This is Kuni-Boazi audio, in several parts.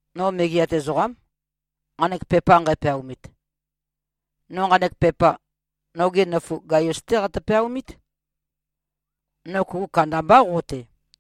No megeat ezoqám, nqanek pepa nqæpeaomit. No nqanek pepa, noge nøfu Gaius-té qatø-peaomít. No kuku kandambá, qo-te.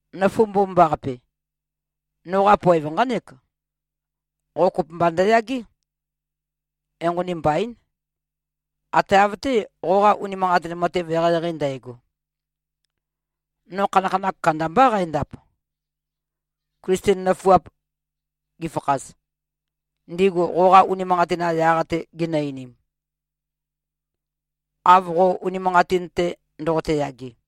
Nøfu mbomambaqape! Noqa poev nqánek: Qo kopømba ndøyagé, enqoni mbain, ate av-té, qoqa unimanqatin matev eqeieqei ndægo. No khanakhanakh kandambá qændap, Klisten nøfuap gifakhaz, ndigu qoqa unimanqatin-qa yaq-te ginø-einim, av qo unimanqatin-te ndoqote-yage.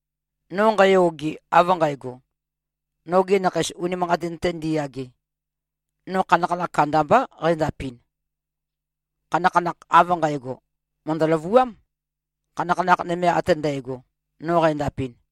No nqæyoge, av nqægo, nogi nakheis unimanqatin-te ndiyage, no khanakhanakh kandambá qændapɨn. Khanakhanakh av nqægo, mø̀ndø-løvuám, khanakhanakh nøme ate ndægo, no qændapɨn.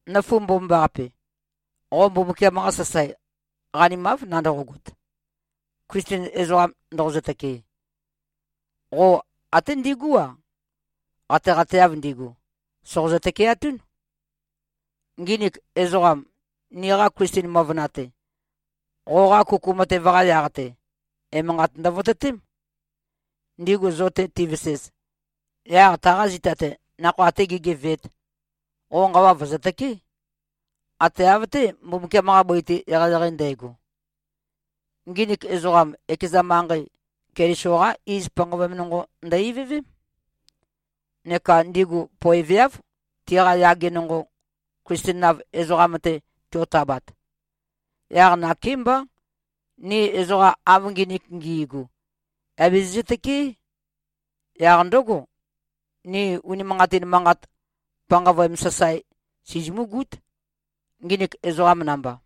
Nøfu mbomambaqape! Qo Mbumbukiam-qa sasae qanimáv nandoqogot, Klisten ezoqa ndoqozø-tøkee. Qo até ndigú-a, qateqateav ndigu, sòqozø-tøkeatún. Nginik ezoqam, niqa Klisten møvøna-te, qoqa kuku matev-qa yaq-te, emanqat ndøvototém. Ndigu zo-te tivesez, yaq taqa zita-te nakhoa atē gēgeveēt, qo nqawa vø̀zøtøké, ate av-té, Mbumbukiam-qa bøi-te, eqeieqei ndægo. Nginik ezoqam, ekeza manqei, Keliso-qá iz panqavøem nonqo ndø-ivøvém, neka ndigu poeveáv, tiqa yage nonqo, Klisten-av ezoqam-te tiotabat. Yaq nakémbá, ni ezoqam av nginik ngi꞉gu, yà bizizø-tøkeé. Yaq ndǿgo, ni unimanqatin manqat panqavøem sasae sizimúgút, nginik ezoqam namba.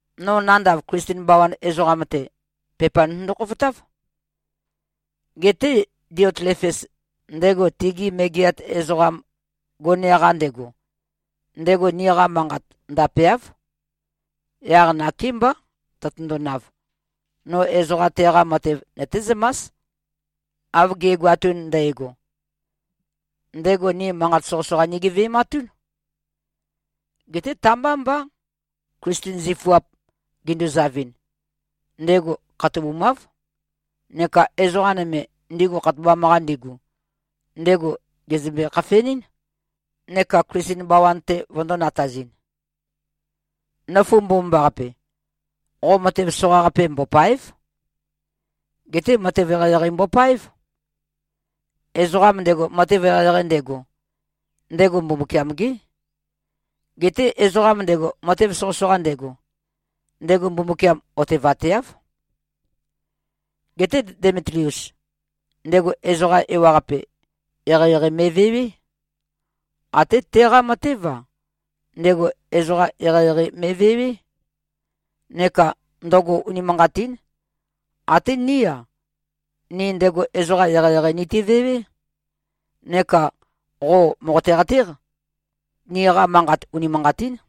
No nandav Klisten bawan ezoqam-te, pepa notøndo-khofotáv. Geté Diotlefes, ndego tigi megeat ezoqam gone-qa ndego, ndego niqa manqat ndapeáv. Yaq nakémbá, tøtøndonav, no ezoqa teqa matev nøtézømás, av ge꞉goatun ndægo. Ndego ni manqat soqøsoqa nigeve꞉matún. Geté ta-mbá mbá. Klisten zifuap, ginduzavɨn, ndego khatobumáv. Neka ezoqa nøme, ndigu khatobam-qa ndigu, ndego gèzømbe-khafenɨ́n, neka Klisten bawan-te vøndō-natazɨn. Nøfu mbomambaqape! Qo matev soqaqape mbòpa᷄ev. Geté matev eqeieqei mbopáev. Ezoqam ndego, matev eqeieqei ndego, ndego Mbumbukiam-gé. Geté ezoqam ndego, matev soqøsoqa ndego, ndego Mbumbukiam otevateáv. Geté Demitlius, ndego ezoqa ewaqape, eqeieqei me꞉vewé. Até teqa matév-a, ndego ezoqa eqeieqei me꞉vewé. Neka ndøgo unimanqatín. Até ní-a, ni ndego ezoqa eqeieqei nitivewé. Neka qo mòqote-qatéq, niqa manqat unimanqatín.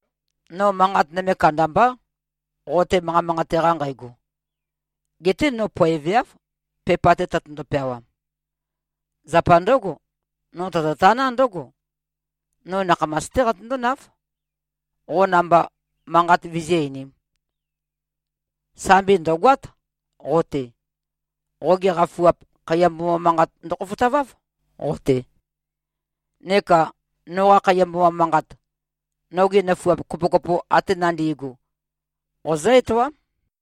No manqat nøme kandambá, qo-te manqa manqate-qa nqægo. Geté no poeveáv, pepa-te tøtøndo-peawam. Zapa ndǿgo, no tototaná ndǿgo: No nakhamas-té qatøndónáv, qo namba manqat vizí-einīm. Sambi ndø̀goát, qo-te. Qogi qafuap, khaiya mboma manqat ndøkhofotaváv, qo-te. Neka noqa khaiya mboma manqat, nogi nøfuap kopokopo ate nandi꞉gu, qozǿ-etoám.